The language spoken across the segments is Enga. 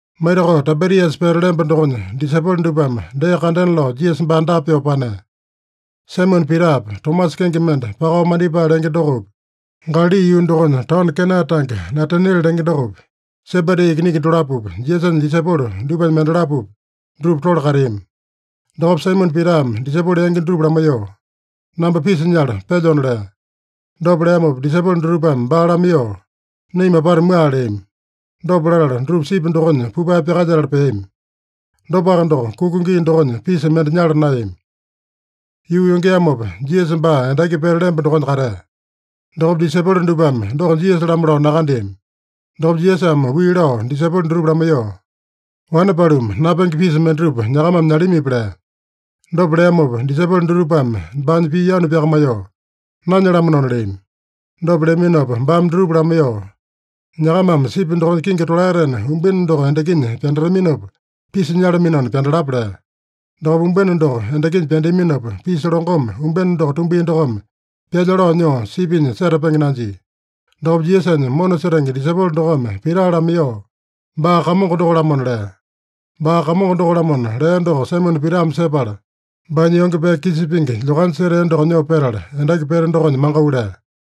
Maitakao Taibiriasa pete lemba dokonya disaipolo dupame dee kandena lao Jisasa baa dapa pyoo panea. Saimone Pitapi, Tomasa kenge mende Pakao Mandipae lenge dokopi, Galali yuu dokonya taono Kena tange Nataniele lenge dokopi, Sebedi ikiningi dolapopi, Jisasanya disaipolo dupanya mendalapopi, dutupa tole kateami. Dokopa Saimone Pitame disaipolo yangi dutupa lamaiyoo, “Namba pisa nyala pelyona” lea. Dopa leamopa disaipolo dutupame baa lamaiyoo, “Naima apata mua” leami. Dopa latala, dutupa sipi dokonya pupae pyakalyetala peami. Dopaka doko, kuka gii dokonya pisa mende nyala naeyami. Yuu yongeamopa, Jisasa baa endaki pete lemba dokonya katea. Dokopa disaipolo dupame doko Jisasa-lamo lao nakandeami. Dokopa Jisasame wii lao disaipolo dutupa lamaiyoo, “Wane paluma, napenge pisa mendatupa nyakamame nyalamipi?” lea. Dopa leamopa disaipolo dutupame baanya pii yanu pyakamaiyoo, “Nanyalamanona” leami. Dopa leaminopa baame dutupa lamaiyoo, “Nyakamame sipi dokonya kingi tolaetena umbene doko endakinya pyandataminopa pisa nyalaminona pyandalapa” lea. Dokopa umbene doko endakinya pyandeaminopa, pisa longome umbene doko tumbia dokome, pyalya lao nyoo sipinya setapenge nanjia. Dokopa Jisasanya mona setenge disaipolo dokome Pita lamaiyoo, “Baa Kamongo doko-lamona” lea. “Baa Kamongo doko-lamona” lea doko Saimone Pitame sepala, baanya yonge pee kisa pingi lyokanya setea doko nyoo petala, endaki pete dokonya mangau lea.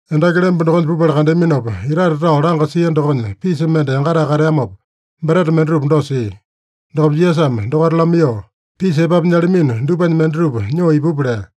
Endaki lemba dokonya pupala kandeaminopa, itate tao langa sia dokonya pisa mende yangatae kateamopa, breta mendatupa dosa sia. Dokopa Jisasame dokaita lamaiyoo, “Pisa epapu nyalamino dupanya mendatupa nyoo ipupa” lea.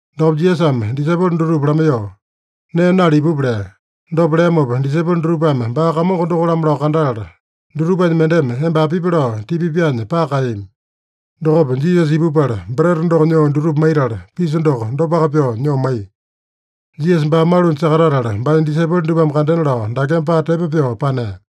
Dokopa Jisasame disaipolo dutupa lamaiyoo, “Nee nala ipupa” lea. Dopa leamopa disaipolo dutupame baa Kamongo doko-lamo lao kandatala, dutupanya mendeme, “Emba apipi?” lao tipa pyaanya paka kaeyami. Dokopa Jisasa ipupala breta doko nyoo dutupa maitala, pisa doko dopaka pyoo nyoo maiya. Jisasa baa malunya sakatatala, baanya disaipolo dupame kandena lao dakeme paa tepo pyoo panea.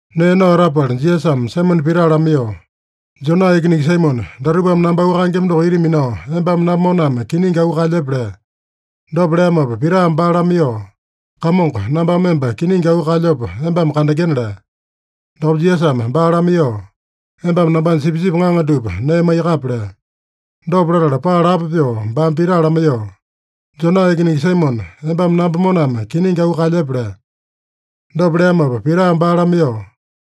Nee nao etapala Jisasame Saimone Pita lamaiyoo, “Jona ikiningi Saimone, datupame namba auu kaengema doko ita minao embame namba moname kiningi auu kaelyepe?” lea. Dopa leamopa Pitame baa lamaiyoo, “Kamongo, nambame emba kiningi auu kaelyopa embame kandengena” lea. Dokopa Jisasame baa lamaiyoo, “Embame nambanya sipisipi ŋaŋa dupa nee maiyakape” lea. Dopa latala paa lapo pyoo baame Pita lamaiyoo, “Jona ikiningi Saimone, embame namba moname kiningi auu kaelyepe?” lea. Dopa leamopa Pitame baa lamaiyoo,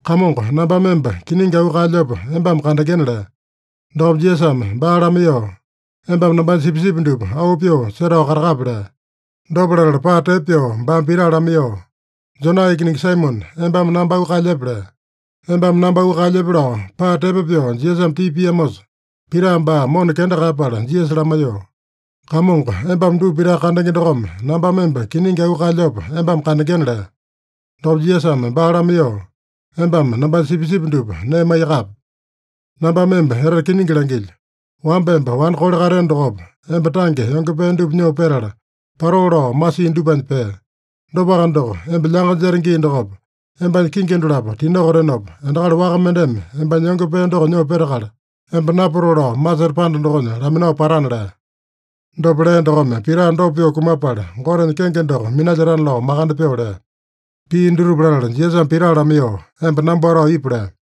“Kamongo, nambame emba kiningi auu kaelyopa embame kandengena” lea. Dokopa Jisasame baa lamaiyoo, “Embame nambanya sipisipi dupa auu pyoo setao katakape” lea. Dopa latala paa tepo pyoo baame Pita lamaiyoo, “Jona ikiningi Saimone, embame namba auu kaelyepe?” lea. “Embame namba auu kaelyepe?” lao paa tepo pyoo Jisasame tipa piamosa, Pita baa mona kenda kaeyapala Jisasa lamaiyoo, “Kamongo, embame dupa pitaka kandenge dokome, nambame emba kiningi auu kaelyopa embame kandengena” lea. Dokopa Jisasame baa lamaiyoo, “Embame nambanya sipisipi dupa nee maiyakape. Nambame emba etete kiningi langilyo: Wamba emba wane kole kateeno dokopa, emba tange yonge pee dupa nyoo petala, patoo lao masiino dupanya pee. Dopaka doko, emba lyanga jete gii dokopa, embanya kingi dolapo tinokotenopa, endakali waka mendeme embanya yonge pee doko nyoo petakala, emba napatoo lao masete panda dokonya laminao patana” lea. Dopa lea dokome Pita dopa pyoo kumapala, Gotenya kenge doko minalyetana lao makande pyoo lea. Pii dutupa latala Jisasame Pita lamaiyoo, “Emba namba watao ipu” lea.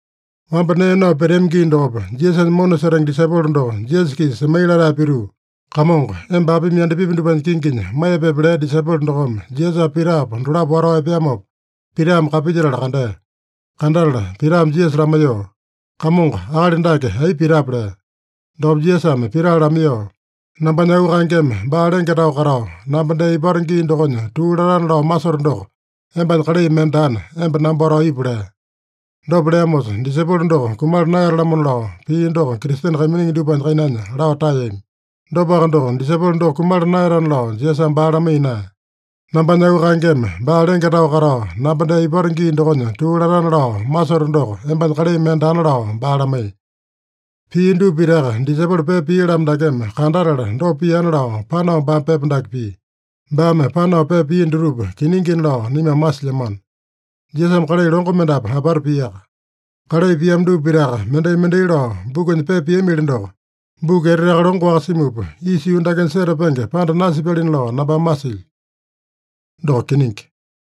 Wamba nee nao peteami gii dokopa, Jisasanya mona setenge disaipolo doko Jisasa-kisa semai latae pituu, “Kamongo, emba apimi yandapipi dupanya kinginya maiyepepe” lea disaipolo dokome Jisasapa Pitapa dolapo watao epeamopa, Pitame kapilyetala kandea. Kandatala Pitame Jisasa lamaiyoo, “Kamongo, akali dake aipa pitape?” lea. Dokopa Jisasame Pita lamaiyoo, “Nambanya auu kaengeme baa lenge tao katao, namba dee ipato gii dokonya tuu latana lao masoto doko embanya kalai mende daana, emba namba watao ipu” lea. Dopa leamosa, disaipolo doko kumala naeyata-lamona lao pii doko Kristene kaiminingi dupanya kainanya lao taeyami. Dopaka doko, disaipolo doko kumala naeyatana lao Jisasame baa lamaiya naeya. “Nambanya auu kaengeme baa lenge tao katao, namba dee ipato gii dokonya tuu latana lao masoto doko embanya kalai mende daana” lao baa lamaiya. Pia dupa pitaka disaipolo pepa pia-lamo dakeme kandatala dopa piana lao panao baame pepa dake pia. Baame panao pepa pia dutupa kiningina lao naimame masilyamano. Jisasame kalai longo mendapu apata piaka. Kalai piamo dupa pitaka mendai-mendai lao bukunya pepa piamili doko, buku eteteaka longo-waka simupa, isa yuu dakenya setapenge panda nasipyalina lao nambame masilyo. Doko kiningi.